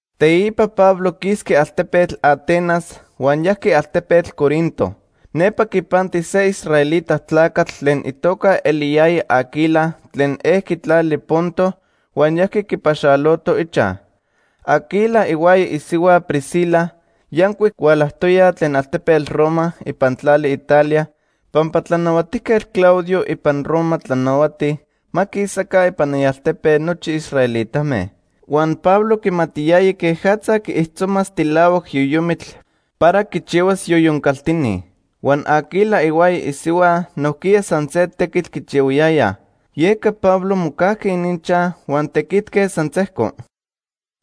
Teipa Pablo quisqui altepetl Atenas huan yajqui altepetl Corinto. Nepa quipanti se israelita tlacatl tlen itoca eliyaya Aquila tlen ejqui tlali Ponto huan yajqui quipaxaloto ichaj. Aquila ihuaya isihua Priscila yancuic hualajtoyaj tlen altepetl Roma ipan tlali Italia pampa Tlanahuatijquetl Claudio ipan Roma tlanahuati ma quisaca ipan ialtepe nochi israelitame. Huan Pablo quimatiyaya quejatza quiijtzomas tilahuac yoyomitl para quichihuas yoyon caltini. Huan Aquila ihuaya isihua nojquiya san se tequitl quichihuayayaj. Yeca Pablo mocajqui ininchaj huan tequitque san sejco.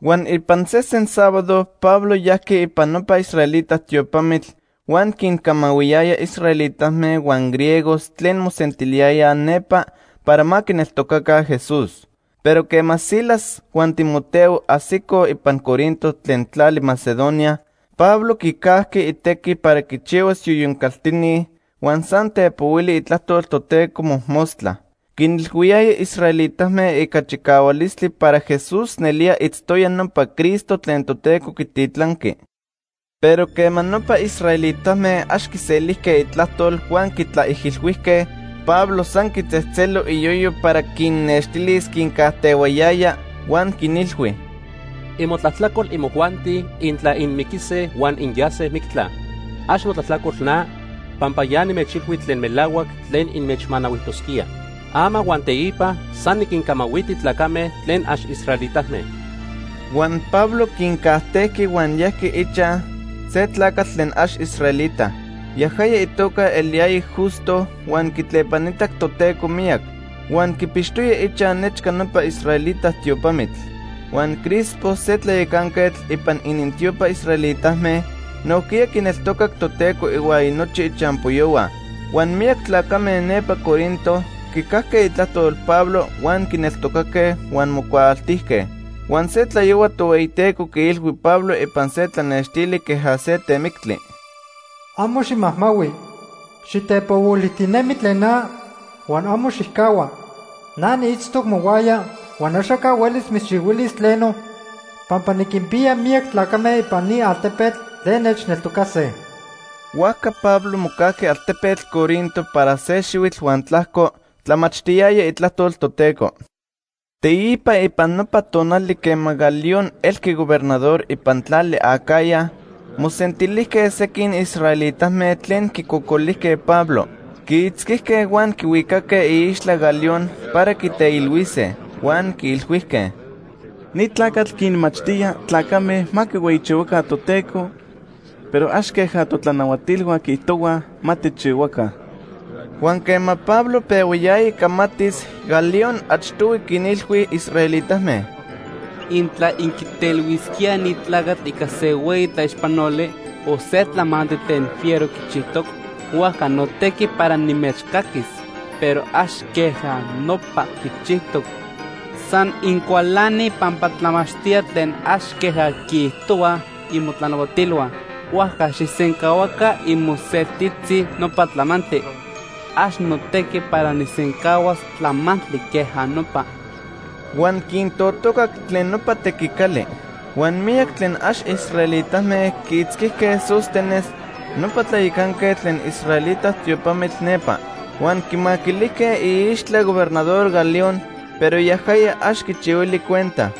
Huan ipan sesen sábado Pablo yajqui ipan nopa israelita tiopamitl huan quincamahuiyaya israelitame huan griegos tlen mosentiliyayaj nepa para ma quineltocaca Jesús. Pero quema Silas huan Timoteo ajsicoj ipan Corinto tlen tlali Macedonia, Pablo quicajqui itequi para quichihuas yoyon caltini huan san tepohuili itlajtol Toteco mojmostla. Quinilhuiyaya israelitame ica chicahualistli para Jesús nelía itztoya nopa Cristo tlen Toteco quititlanqui. Pero quema nopa israelitame ax quiselijque itlajtol huan quitlaijilhuijque, Pablo san quitzejtzelo iyoyo para quinnextilis quincajtehuayaya, huan quinilhui: ―Imotlajtlacol imojuanti intla inmiquise huan inyase mictla. Ax notlajtlacol na, pampa ya nimechilhui tlen melahuac tlen inmechmanahuijtosquía. Ama huan teipa san niquincamahuiti tlacame tlen ax israelitame. Huan Pablo quincajtejqui huan yajqui ichaj se tlacatl tlen ax israelita. Yajaya itoca eliyaya Justo huan quitlepanitac Toteco miyac. Huan quipixtoya ichaj nechca nopa israelita tiopamitl. Huan Crispo, se tlayacanquetl ipan inintiopa israelitame, nojquiya quineltocac Toteco ihuaya nochi ichampoyohua. Huan miyac tlacame nepa Corinto quicajque itlajtol Pablo huan quineltocaque huan mocuaaltijque. Huan se tlayohua Tohueyiteco quiilhui Pablo ipan se tlanextili queja se temictli: “Amo ximajmahui. Xitepohuilijtinemi tlen na huan amo xijcahua. Na niitztoc mohuaya, huan axaca huelis mitzchihuilis tleno, pampa niquinpiya miyac tlacame ipan ni altepetl tlen nechneltocase.” Huajca Pablo mocajqui altepetl Corinto para se xihuitl huan tlajco tlamachtiyaya itlajtol Toteco. Teipa ipan nopa tonali quema Galión elqui gobernador ipan tlali Acaya, mosentilijque sequin israelitame tlen quicocolijque Pablo. Quiitzquijque huan quihuicaque iixtla Galión para quiteilhuise. Huan quiilhuijque: ―Ni tlacatl quinmachtía tlacame ma quihueyichihuaca Toteco, pero ax queja totlanahuatilhua quiijtohuaj ma tijchihuaj. Huan quema Pablo pehuayaya camatis, Galión achtohui quinilhui israelitame: ―Intla inquiteilhuisquíaj ni tlacatl ica se hueyi tlaixpanoli o se tlamantli tlen fiero quichijtoc, huajca notequi para nimechcaquis. Pero ax queja nopa quichijtoc. San incualanij pampa tlamachtía tlen ax queja quiijtohuaj imotlanahuatilhua, huajca xijsencahuaca imoseltitzi nopa tlamantli. Ax notequi para nijsencahuas tlamantli queja nopa. Huan quintotocac tlen nopa tequicali. Huan miyac tlen ax israelitame quiitzquijque Sóstenes, nopa tlayacanquetl tlen israelita tiopamitl nepa. Huan quimaquilijque iixtla Gobernador Galión, pero yajaya ax quichihuili cuenta.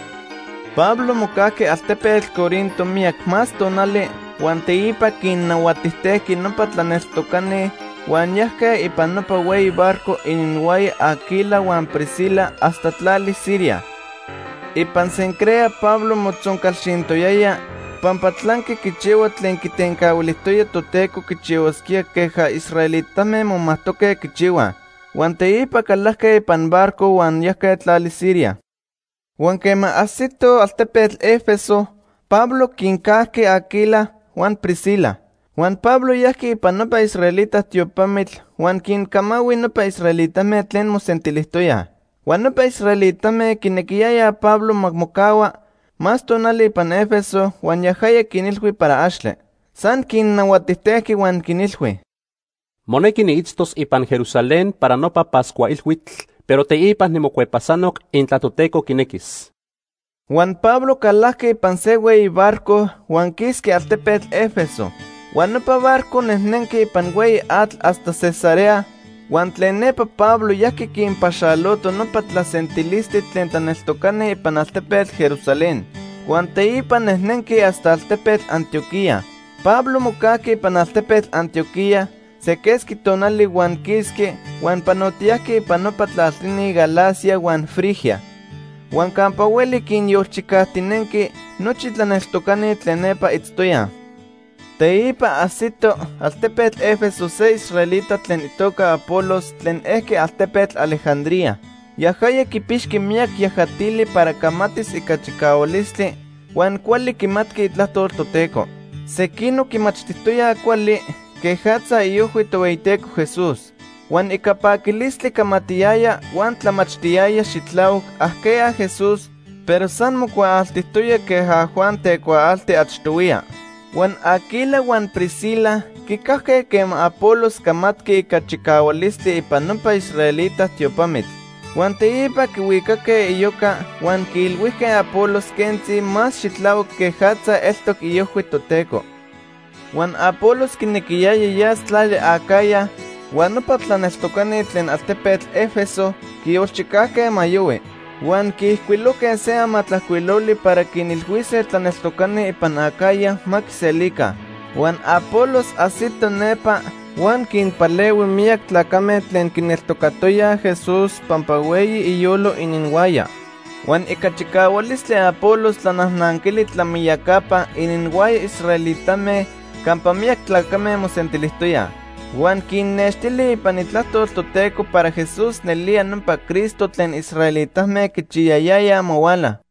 Pablo mocajqui altepetl Corinto miyac más tonali huan teipa quinnahuatijtejqui nopa tlaneltocani, huan yajque ipan nopa hueyi barco ininhuaya Aquila huan Priscila hasta tlali Siria. Ipan Cencrea Pablo motzoncalxintoyaya pampa tlanqui quichihua tlen quitencahuilijtoya Toteco quichihuasquía queja israelitame momajtoque quichihuaj. Huan teipa calajque ipan barco huan yajque tlali Siria. Huan quema ajsitoj altepetl Éfeso, Pablo quincajqui Aquila huan Priscila. Huan Pablo yajqui ipan nopa israelita tiopamitl huan quincamahui nopa israelitame tlen mosentilijtoyaj. Huan nopa israelitame quinequiyayaj Pablo ma mocahua más tonali ipan Éfeso huan yajaya quinilhui para axtle. San quinnahuatijtejqui huan quinilhui: “Monequi niitztos ipan Jerusalén para nopa Pascua Ilhuitl, pero teipa nimocuepasanoc intla Toteco quinequis.” Huan Pablo calajqui ipan se hueyi barco huan quisqui altepetl Éfeso. Huan nopa barco nejnenqui ipan hueyi atl hasta Cesarea. Huan tlen nepa Pablo yajqui quinpaxalotoj nopa tlasentilistli tlen tlaneltocani ipan altepetl Jerusalén. Huan teipa nejnenqui hasta altepetl Antioquía. Pablo mocajqui ipan altepetl Antioquía se quesqui tonali huan quisqui huan panotiyajqui ipan nopa tlaltini Galacia huan Frigia. Huan campa hueli quinyolchicajtinenqui nochi tlaneltocani tlen nepa itztoyaj. Teipa ajsito altepetl Éfeso se israelita tlen itoca Apolos tlen ejqui altepetl Alejandría. Yajaya quipixqui miyac yajatili para camatis ica chicahualistli huan cuali quimatqui Itlajtol Toteco. Sequinoc quimachtijtoyaj cuali quejatza iojhui Tohueyiteco Jesús. Huan ica paquilistli camatiyaya huan tlamachtiyaya xitlahuac ajqueya Jesús, pero san mocuaaltijtoya queja Juan tecuaalti achtohuiya. Huan Aquila huan Priscila quicajque quema Apolos camatqui ica chicahualistli ipan nopa israelita tiopamitl. Huan teipa quihuicaque iyoca huan quiilhuijque Apolos quentzi más xitlahuac quejatza eltoc iojhui Toteco. Huan Apolos quinequiyaya yas tlali Acaya, huan nopa tlaneltocani tlen altepetl Éfeso quiyolchijcajque ma yohui. Huan quiijcuilojque se amatlajcuiloli para quinilhuise tlaneltocani ipan Acaya ma quiselica. Huan Apolos ajsito nepa huan quinpalehui miyac tlacame tlen quineltocatoyaj Jesús pampa hueyi iyolo ininhuaya. Huan ica chicahualistli Apolos tlanajnanquili tlamiyacapa ininhuaya israelitame campa miyac tlacame mosentilijtoyaj. Huan quinnextili ipan Itlajtol Toteco para Jesús nelía nopa Cristo tlen israelitame quichiyayayaj ma huala.